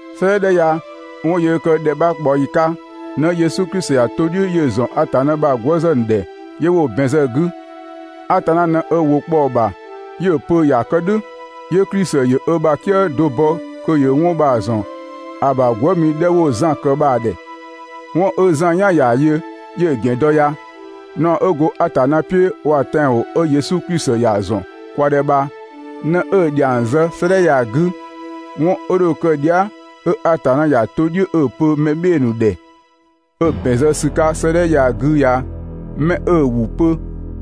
'Sëëdhɛ 'dhɛ ya 'wɔn 'ö yöö kë ‑dhɛ 'bha ꞊kpaɔyi 'ka ꞊në Yesu Klisi ‑ya to "dhiʋ̈ 'yö‑ ‑zɔn Atanna ‑bha gwëëzë ‑nu ‑dhɛ 'yö 'wo‑ ‑bɛn zë‑ 'gü. Atanna ꞊në ö ‑wʋ kpɔ‑ ‑bha 'yö‑ pö ‑ya kë "dhʋ̈, 'yö Klisi ‑yö ö ‑bha "kië do bɔ kö ‑yö 'wɔn bha‑ ‑zɔn ‑a ‑bha gwëëmi 'dhɛ 'wo‑ Zan ‑kë bha‑ ‑dhɛ. 'Wɔn 'ö Zan "yan ‑ya yö 'yö‑ ‑gɛn dɔ ya. Naɔ 'ö go Atanna "piʋ̈ waa‑ tɛanwɔn 'ö Yesu Klisi ‑ya ‑zɔn kwa ‑dhɛ bha ꞊në 'ö‑ ‑dhiang zë 'sëëdhɛ ya‑ 'gü. 'Wɔn dho kë dhia", 'ö Atanna ‑ya to "dhiʋ̈ 'ö‑ pö mɛ "bhɩɩ‑ ‑nu ‑dhɛ, 'ö ‑bɛn zë ‑sü 'ka 'sëëdhɛ ya‑ 'gü ya 'mɛ 'ö‑ ‑wʋ pö,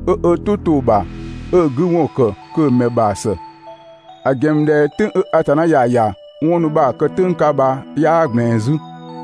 'ö ö "tʋ to‑ ‑bha, 'ö‑ 'gü ‑wɔn ‑kë kö‑ ‑mɛ ‑bha ‑së! ‑A ‑gɛn ‑mü ꞊dhɛ "tʋ̈ng 'ö Atanna ‑ya ‑ya 'wɔn ‑nu bha‑ kë "tʋ̈ng 'ka bha 'yaa ꞊gblɛɛn 'zü.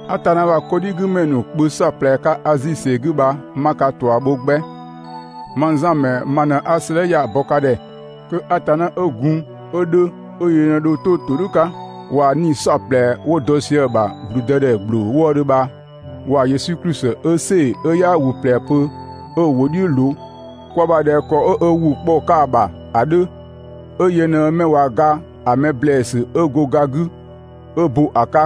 Atanna ‑bha 'kɔdhigümɛ ‑nu kpö "saɔplɛ 'ka Azi ‑sɛ 'gü bha 'ma ka ꞊tua bho 'gbɛ. Mang Zan ‑mɛ ma ꞊në 'a 'sëëdhɛ ya‑ bɔ ka ‑dhɛ. Kö Atanna 'ö gun, 'ö 'dhö, 'ö yö ꞊në dho 'to ‑todhʋ̈ 'ka waa‑ 'nii‑ "saɔplɛ 'wo dɔ sië‑ ‑bha ‑gblüdëdhɛ ‑gbloo wëëdhö bha, waa‑ Yesu Klisi 'ö‑ "sɛɛ‑ 'ö 'yaa ‑wʋ ꞊plɛ pö, 'ö‑ ‑wʋ "dhiʋ̈ ꞊loo kwa ‑bha ꞊dhɛ ‑kɔ 'ö ö ‑wʋ kpɔ‑ 'ka‑ ‑bha ‑a 'dhö, 'ö yö ꞊në 'mɛ ꞊wa ga ‑a mɛ ‑blɛɛsü 'ö go ga 'gü 'ö ‑bö ‑a 'ka,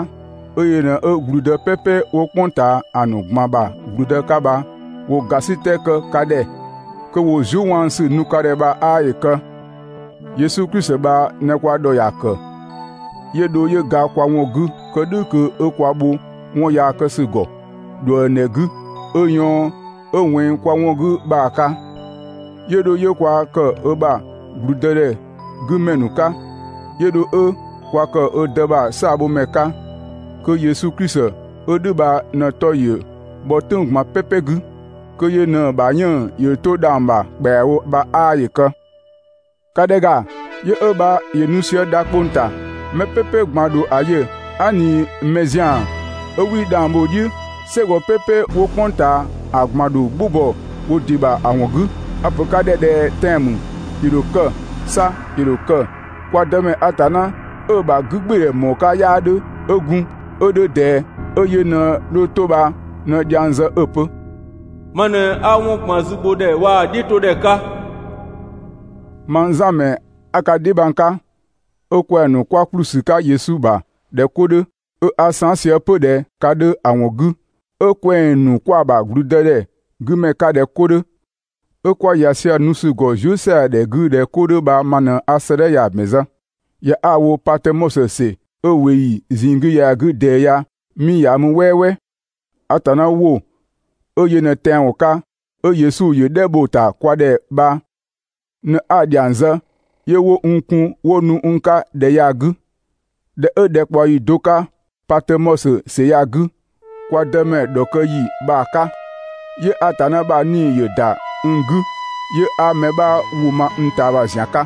'ö yö ꞊në ‑gblüdë "pɛpɛ 'wo "kpʋng ꞊taa ‑a ‑nu ꞊gban ‑bha ‑gblüdë 'ka bha ‑wo ‑gasitɛ kë ka ‑dhɛ, kö ‑wo zuëwaanusü nu ka ‑dhɛ bha 'aa ‑yö kë. Yesu Klisi bha ꞊në kwa ‑dhɔ ‑ya ‑kë, 'yö dho 'yö ga kwa ‑wɔn 'gü kë "dhʋ̈ kö 'ö kwa bho 'wɔn yaa kë ‑sü ‑gɔ ꞊dhuëngdhɛ 'gü 'ö ꞊yɔɔn 'ö ꞊wɛnng kwa ‑wɔn 'gü bha‑ 'ka. 'Yö dho 'yö kwa ‑kë ö ‑bha ‑gblüdëdhɛ 'gü ‑mɛ ‑nu 'ka, 'yö dho 'ö kwa ‑kë ö Dë "saabhomɛ 'ka, kö Yesu Klisi 'ö "dhʋ̈ bha ꞊në‑ 'tɔ ‑yö bhɔ "tʋ̈ng ꞊gban "pɛpɛ 'gü, kö yö ꞊në‑ ‑bha 'yënng‑ ‑yö 'to dhang‑ ‑bha ‑kpɛawo bha 'aa ‑yö kë! ‑Ka ‑dhɛ ‑ga, yö 'ö bha ‑yö nu sië dha 'kpong‑ ‑ta. Mɛ "pɛpɛ ꞊gban‑ ‑dho ‑a yö, aa" ꞊ni mɛ ‑zian 'ö 'wii 'dhang bho‑ "dhiʋ̈. "Sɛgɔ "pɛpɛ 'wo "kpʋng ꞊taa ‑a ꞊gban ‑dho "gbʋ bɔ wo ‑dɩ ‑bha ‑a ‑wɔn 'gü. A‑ ‑pö ka ‑dhɛ ꞊dhɛ tɛan‑ ‑mü, ‑yö ‑dho kë! 'Sa ‑yö ‑dho kë! Kwa Dëmɛ Atanna 'ö‑ ‑bha 'gügbɩɩdhɛ ‑mɔɔ 'ka 'yaa 'dhö, 'ö gun, 'ö 'dhö ꞊dɛɛ, 'ö yö ꞊në dho 'to bha ꞊në dhiang zë 'ö‑ pö: «Ma ꞊në 'a 'wɔn ꞊gban zübhodhɛ waa‑ "dhiʋ̈todhɛ 'ka.» Mang Zan ‑mɛ 'a ka dheebhang 'ka, 'ö kwɛng‑ ‑nu 'kwa ‑kplü ‑sü 'ka Yesu ‑bha ꞊dhɛ 'ko 'dhö, 'ö 'a saan" sië 'pö ꞊dhɛ ka 'dhö ‑a ‑wɔn 'gü, 'ö kwɛng‑ ‑nu 'kwa‑ ‑bha ‑gblüdëdhɛ 'gü ‑mɛ 'ka ꞊dhɛ 'ko 'dhö, 'ö 'kwa ‑ya sië‑ nu ‑sü ‑gɔ zuë" ‑sɛadhɛ 'gü ꞊dhɛ 'ko 'dhö bha ma ꞊në 'a 'sëëdhɛ ya‑ ‑bɛn zë. ‑Ya 'a‑ wo Patömɔsö ‑sɛ 'ö ꞊weeyi ꞊zinng 'gü ya‑ 'gü ꞊dɛɛ ya 'mii ‑ya mü "wɛɛwɛɛ. Atanna ‑wʋ 'ö yö ꞊në tɛanwɔn 'ka 'ö Yesu ‑yö "dhɛ bho‑ ‑ta kwa ‑dhɛ bha ꞊në 'a‑ ‑dhiang zë 'yö 'wo n kun 'wo nu n 'ka ‑dhɛ ya‑ 'gü. ꞊Dhɛ 'ö ‑dhɛkpaɔyi do 'ka Patömɔsö ‑sɛ ya‑ 'gü, kwa Dëmɛ ‑dhɔkë ‑yi bha‑ 'ka, 'yö Atanna ‑bha 'Nii‑ ‑yö ‑da n 'gü, 'yö 'a mɛ 'bha ‑wʋ ma n ꞊taama ‑zian 'ka,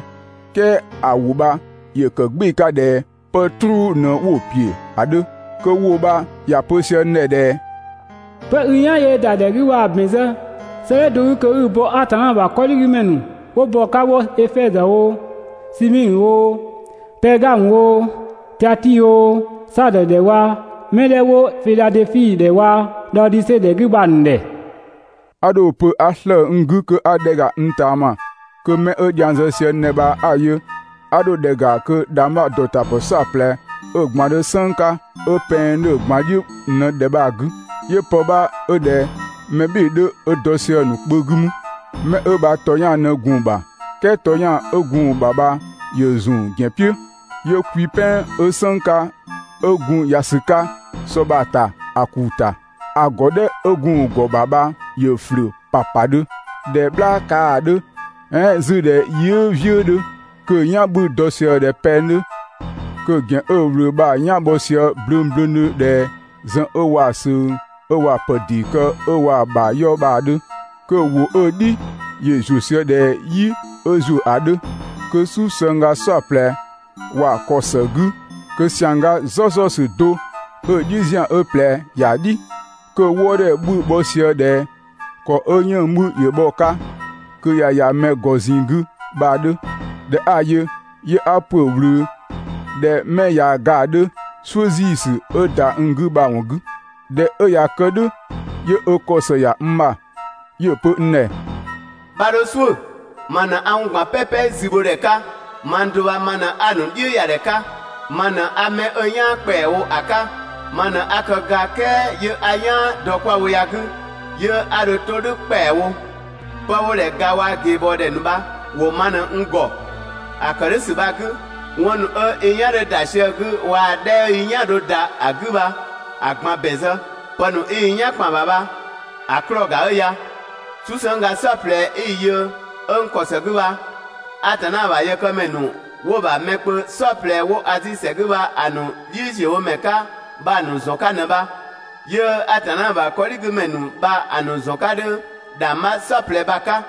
"kɛɛ ‑a ‑wʋ bha ‑yö ‑kë "gbɩɩ‑ 'ka ꞊dhɛ 'pë "truu ꞊në 'wo‑ ‑piö ‑a 'dhö. Kö ‑wʋ bha ‑ya pö sië n ‑dhɛ ꞊dhɛ: «'Pë i "yan yöö ‑da ‑dhɛ 'gü bha‑ ‑bɛn zë 'sëëdhɛ do 'gü kö 'i‑ bɔ Atanna ‑bha 'kɔdhigümɛ ‑nu 'wo bɔ‑ 'ka 'wo Efɛzö oo, Simiidhö oo, Pɛɛgamö oo, Tiatii oo, Saadö ‑dhɛ waa‑ 'mɛ 'dhɛ 'wo Fidhadɛfi ‑dhɛ waa‑ Dhaodise ‑dhɛ ‑nu 'gü bha‑ ‑nu ‑dhɛ.» 'A dho‑ pö 'a slëë‑ n 'gü kö 'a ‑dhɛ ‑ga n ꞊taama kö 'mɛ 'ö dhiang zë sië n ‑dhɛ bha 'a‑ yö, 'a dho ‑dhɛ ‑ga kö ‑dhangbha ‑dɔtapë "saɔplɛ 'ö‑ ꞊gban 'dhö "sënng 'ka, 'ö pɛng 'dhö‑ ꞊gban "dhiʋ̈ ꞊në ‑dhɛ bha‑ 'gü, 'yö pë 'bha 'ö ꞊dhɛ mɛ "bhɩɩ‑ 'dhö, 'ö dɔ sië‑ ‑nu kpö 'gü mü. Mɛ 'ö bha ‑tɔyang ꞊në gun‑ ‑bha, "kɛɛ ‑tɔyang 'ö gun‑ ‑bha bha ‑yö ‑zun ‑gɛn "piʋ̈. 'Yö kwi "pɛn 'ö "sënng 'ka 'ö gun ‑ya ‑sü 'ka sɔ bha‑ ‑ta ‑a ‑kuu ‑ta. ‑A ‑gɔdhɛ 'ö gun‑ ‑gɔ ‑bha bha ‑yö ‑flʋ̈ ‑papadhö ꞊dhɛ "bhlaa kaa‑ 'dhö, "ɛɛn 'zü ꞊dhɛ yɩɩ" "vië 'dhö, kö‑ "yan 'bhü‑ dɔ sië ꞊dhɛ pɛng 'dhö. Kö‑ ‑gɛn 'ö‑ ꞊wlöö bha‑ "yan‑ bhɔ sië blöngblöngdhö ꞊dhɛ zën 'ö waa‑ ꞊söng, 'ö waa‑ ‑pë ‑dee kë 'ö waa‑ ‑bha 'yɔ bha‑ 'dhö, kö‑ ‑wʋ 'ö‑ "dhi ‑yö ‑zuö sië ꞊dhɛ "yi 'ö ‑zuö ‑a 'dhö. Kö "susëngga "saɔplɛ ‑wa ‑kɔ ‑së 'gü, kö ‑siangga "zɔzɔsü do 'ö‑ "dhiʋ̈ ‑zian 'ö ꞊plɛ ‑ya "dhi. Kö‑ wëëdhɛ 'bhü‑ bhɔ sië ꞊dhɛ ‑kɔ 'ö 'yënng‑ 'bhü ‑yö bhɔ‑ 'ka kö ꞊ya ‑ya mɛ ‑gɔ ꞊zinng 'gü bha‑ 'dhö. ꞊Dhɛ 'a‑ yö, 'yö 'a ‑pö ꞊wlöö ꞊dhɛ 'mɛ ꞊ya ga‑ 'dhö "suʋ̈ ‑ziisü 'ö ‑da n 'gü bha‑ ‑wɔn 'gü. ꞊Dhɛ 'ö ꞊ya kë "dhʋ̈, 'yö ö ‑kɔ ‑së ‑ya n ‑bha, 'yö‑ pö n ‑dhɛ: «'Bha 'dho "suʋ̈! Ma ꞊në 'a 'wɔn ꞊gban "pɛpɛ zübhodhɛ 'ka, mang do bha ma ꞊në 'a‑ ‑nu "dhiʋ̈ ‑ya ‑dhɛ 'ka. Ma ꞊në 'a 'mɛ 'ö "yaan ‑kpɛawo ‑a 'ka, ma ꞊në 'a kë ga, "kɛɛ 'yö a "yaan dɔ 'kwa‑ wo ya‑ 'gü, 'yö 'a dho 'to "dhʋ̈ ‑kpɛawo. 'Pë 'wo‑ ‑dhɛ ga waa‑ ꞊geebɔɔdhɛ ‑nu bha ‑wo ma ꞊në n ‑gɔ. ‑A ‑kë "dhʋ̈ ‑sü bha‑ 'gü, 'wɔn ‑nu 'ö i "yan 'dhö ‑da sië‑ 'gü waa‑ 'dhɛ 'ö i "yan‑ dho ‑da 'gü bha‑ ꞊gban ‑bɛn zë. Pë ‑nu 'i i "yan ‑kpan ‑bha bha‑ 'klɔɔ‑ ‑ga 'ö ya. "Susëngga "saɔplɛ 'i‑ yö 'ö n ‑kɔ ‑së 'gü bha, Atanna ‑bha yëkëmɛ ‑nu 'wo‑ ‑bha mɛ kpö "saɔplɛ 'wo Azi ‑sɛ 'gü bha‑ ‑nu "dhiʋ̈ziöwomɛ 'ka bha‑ ‑nu ‑zɔn 'ka ꞊në bha. 'Yö‑ Atanna ‑bha 'kɔdhigümɛ ‑nu bha‑ ‑nu ‑zɔn 'ka 'dhö ‑dhangbha "saɔplɛ bha‑ 'ka.»